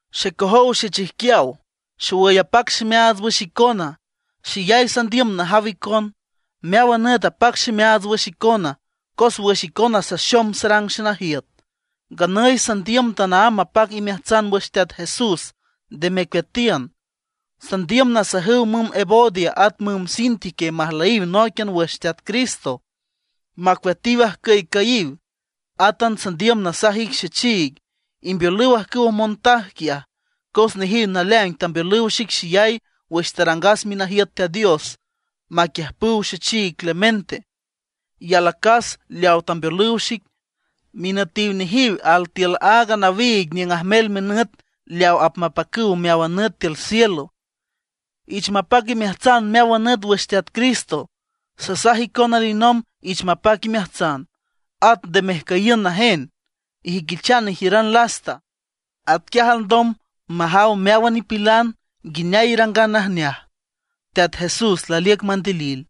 Xecojow xechijquiaw, xowüy apac ximeaats wüx icona, xeyay sandiüm najaw icon. Meáwan nüt apac ximeaats wüx icona, cos wüx icona saxom sarang xenajiüt. Nganüy sandiüm tanaámb mapac imeajtsan wüx Teat Jesús, nde mecueatiün. Sandiüm nasajüw müm Evodia at müm Síntique majlüyiw nóiquian wüx Teat Cristo, macueatiw ajcüycüyiw. Átan sandiüm nasaj ic xechiig, imbeolüw ajcüwa montaj quiaj, cos nejiw naleaing tambeolüw xic xeyay wüx tarangas minajiüt Teat Dios maquiüjpüw xechiig Clemente, y alacas leawa tambeolüw xic. Minütiw nejiw altiül aaga nawiig niüng ajmel minüt leaw apmapacüw meáwan nüt tiül cielo. Ich mapac imeajtsan meáwan nüt wüx Teat Cristo. Sasaj icon alinomb ich mapac imeajtsan. At nde mejcüyiün najen, ijüiquichan ijiüran lasta; atquiaj alndom majaw meáwan nipilan nguineay irangan najneaj. Teat Jesús laliüc mandilil.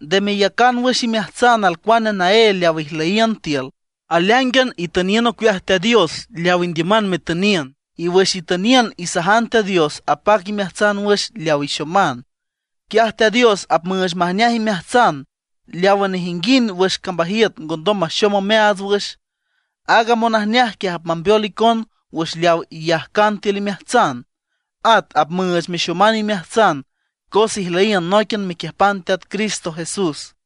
Nde meyacan wüx imeajtsan alcuane naél leaw ijlüyiün tiül; aleáingan itüniün ocueaj Teat Dios leawa indiüman metüniün; y wüx itüniün isajan Teat Dios apac imeajtsan wüx leaw ixoman. Quiaj Teat Dios apmüüch majneaj imeajtsan leawa nejinguind wüx cambajiüt ngondom maxom omeaats wüx. Aaga monajneaj quiaj apmambeol icon wüx leawa iyajcan tiül imeajtsan, at apmüüch mexoman imeajtsan cos ijlüyiün nóiquian mequiüjpan Teat Cristo Jesús.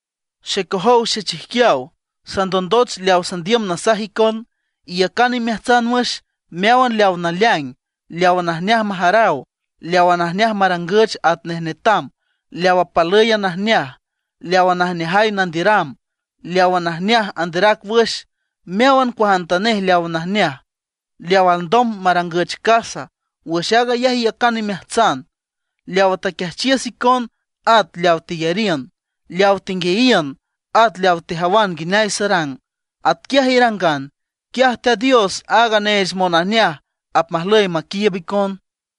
Xecojow xechijquiaw, sandondoch leaw sandiüm nasaj icon. Iyacan imeajtsan wüx meáwan leawa naleaing, leawa najneaj majaraw, leawa najneaj marangüch atnej netam, leawa palǘyan najneaj, leawa najneajay nandiüram, leawa najneaj anderac wüx. Meáwan cuajantanej leawa najneaj, leaw alndom marangüch casa, wüx aag ayaj iyacan imeajtsan. Leawa taquiajchiüs icon at leaw teyariün, leaw tenguiayiün, aton leaw tejawan nguineay sarang, atquiaj irangan. Quiaj Teat Dios, aaga neech monajneaj apmajlüy maquiiüb icon.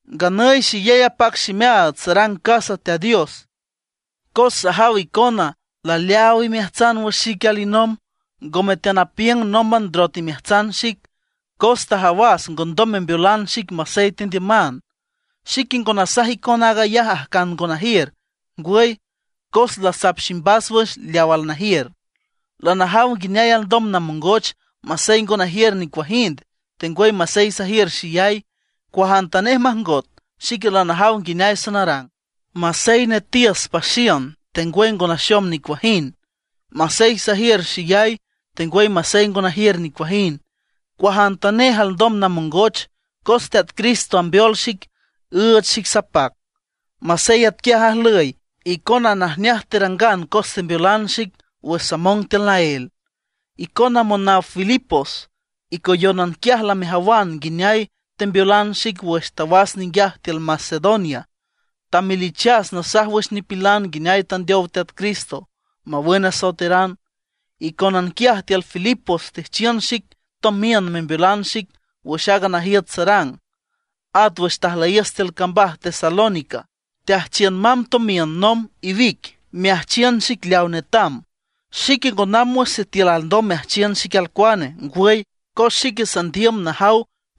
Nganüy xeyay apac ximeaats sarang casa Teat Dios, cos sajaw icona laleaaw imeajtsan wüx xique alinomb. Ngome teanapiüng nómban ndrot imeajtsan xic, cos tajawas ngondom membeolan xic masey tendiüman. Xique ngo nasaj icon aag ayaj ajcan ngo najiür; ngwüy, cos lasap ximbas wüx leaw alnajiür. Lanajaw nguineay alndom namongoch, masey ngo najiür nicuajind, tengwüy masey sajiür xeyay. Cuajantanej majngot, xique lanajaw nguineay sanarang, masey netiüs paxiün, tengwüy ngo naxom nicuajind; masey sajiür xeyay, tengwüy masey ngo najiür nicuajind. Cuajantanej alndom namongoch, cos Teat Cristo ambeol xic, üüch xic sapac. Masey atquiaj ajlüy, icon najneaj terangan cos tembeolan xic wüx samong tiül naél. Icona monaw Filipos, icoyónan quiaj lamejawan nguineay tembeolan xic wüx tawas ninguiaj tiül Macedonia; tamelichas nasaj wüx nipilan nguineay tandeow Teat Cristo mawün asoeteran. Icónan quiaj tiül Filipos teajchiün xic tomiün membeolan xic wüx aaga najiüt sarang. At wüx tajlüyiüs tiül cambaj Tesalónica, teajchiün mamb tomiün nomb iwic, meajchiün xic leawa netam. Xique ngo namb wüx sitiül alndom meajchiün xic alcuane; ngwüy, cos xique sandiüm najaw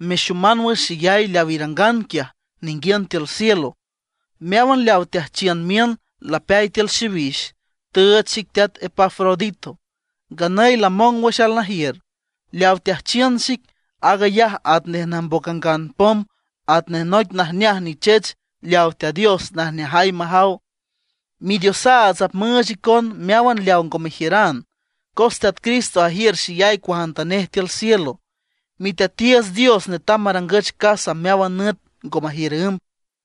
mexoman wüx xeyay leaw irangan quiaj ninguiün tiül cielo. Meáwan leaw teajchiün miün lapeay tiül xiwix, tüüch xic teat Epafrodito. Nganüy lamong wüx alnajiür. Leaw teajchiün xic, aag ayaj atnej najmboc angan pom, atnej noic najneaj nichech leawa Teat Dios najneajay majaw. Midiosaats apmüüch icon meáwan leaw ngo mejiüran, cos Teat Cristo ajiür xeyay cuajantanej tiül cielo. Miteatiiüts Dios netam marangüch casa meáwan nüt ngo majiür ümb.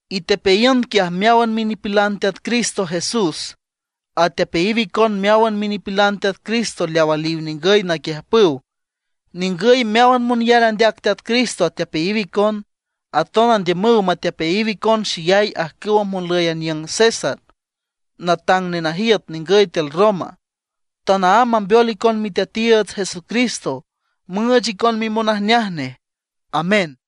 Itepeayiün quiaj meáwan minipilan Teat Cristo Jesús. Atepeayiw icon meáwan minipilan Teat Cristo leawa aliw ningüy naquiüjpüw. Ningüy meáwan monyar andeac Teat Cristo atepeayiw icon, aton andiümüw matepeayiw icon xeyay ajcüwa monlüy aniüng a César, natang nenajiüt ningüy tiül Roma. Tanaámb mambeol icon Miteatiiüts Jesucristo, müüch icon mimonajneaj nej. Amén.